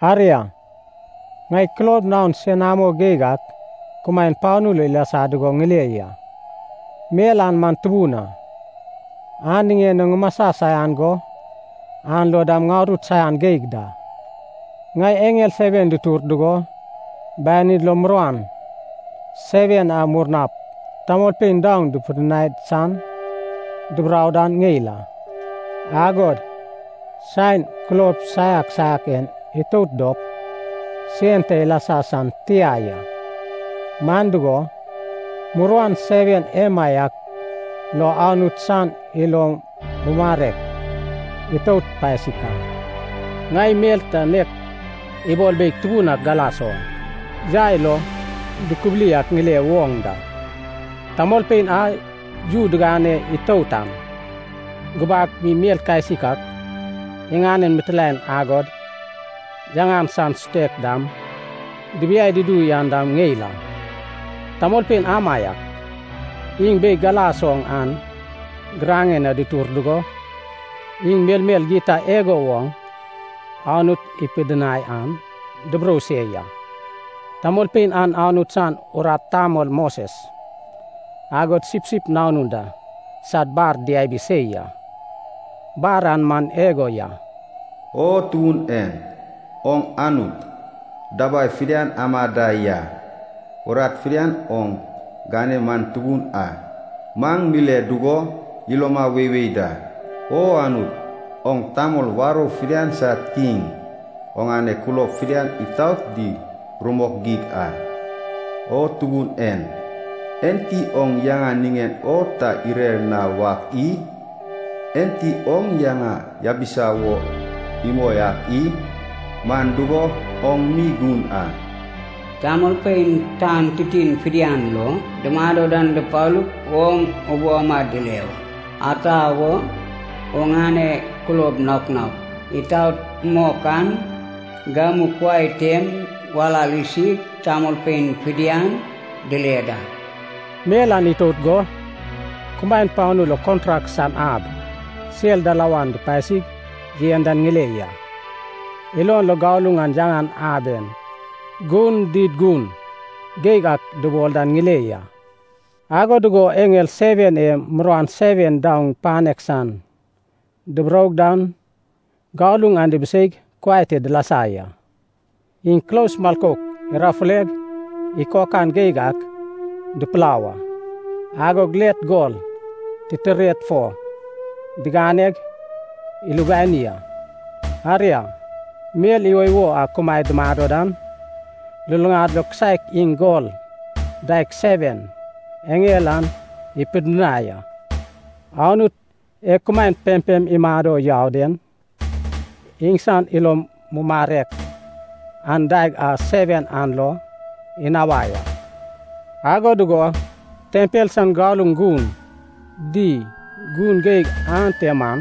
Aria, ŋai kulob naon senamo geig ak kumaen panu lo ilasa dugo ŋile ya. Mel an man tubun a, an niŋen o ŋumasa saian go an lo dam ŋarut saian geig da. Ŋai eŋel seven dutur dugo banid lo muruan seven a murnap tamolpein daoŋ dupidinai san duburou dan ŋeil a. Agod saen kulob saiak saiak en itout dop, sen ta ilasa san tia ya, man dugo, muruan seven emaiak lo Anut san ilo mumarek itout pasik a. Ŋai mel ta nek ibol beig tubun ak galas oŋ, yai lo dukubuli ak ŋile woŋ da. Tamolpein a yu digane itout an, gubak mi mel kasik ak, iŋanen mitilaen agod yaŋan san sutek dam dibiai dudu yan dam ŋeil a. Tamolpein amaiak iŋ beig galas oŋ an giraŋen na dutur dugo, iŋ melmel gita igo woŋ Anut ipidinai an duburou se ya. Tamolpein an Anut san urat tamol Moses, agod Sipsip Nanun da sad bar diabi se ya. Bar an man igo ya. “O Tubun en, oŋ Anut, dabai fidian ama da ya. Urat fidian oŋ gane man tubun a. Maŋ mile dugo, iloma weiwei da. O Anut, oŋ tamol warou fidian sad kiŋ, oŋane kulob fidian itaot di rumok geig a. O Tubun en, enti oŋ yaŋa niŋen o ta irer na wak i? Enti oŋ yaŋa yabisa wo imoi ak i? Man dugo, oŋ mi gun a. Tamolpein tan titin fidian lo dumado dan dupalup oŋ ubou ama dile wa. Ata wo, oŋane kulob naok naok itaot mok an, gamu kuai tem walal isig, tamolpein fidian dile da.” Mel an itout go, kumaen panu lo kontrak san ab sel dalawan dupasig yen dan ŋile ya. Ilon lo galuŋ a yaŋan aben gun di gun geig ak dubol dan ŋile ya. Ago dugo eŋel seven e muruan seven daoŋ panek san duburou dan galuŋ an dibiseig kuai te dilasa ya. Iŋ kulos milkouk irafuleg ikokan geig ak dupulau a, agod let gol titired fo diganeg ilubani a. Aria, mel iwoiwo a kumaed dumado dan, luluŋad lo kisaek iŋ gol daeg seven eŋel an ipidinai a. Anut e kumaen pempem imado yau den, iŋsan ilo mumarek an daeg a seven an lo inawai a. Ago dugo tempel san galuŋ gun di gun geig ante man,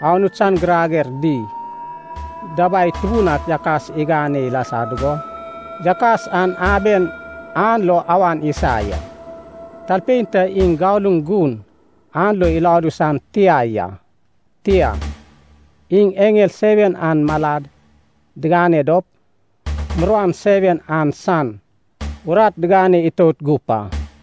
Anut san girager di dabai tubun ak yakas igane ilasa dugo yakas an aben an lo awan isa ya. Talpein ta iŋ galuŋ gun an lo iladu san tia ya. Tia, iŋ eŋel seven an malad digane dop muruan seven an san urat digane itout gup a.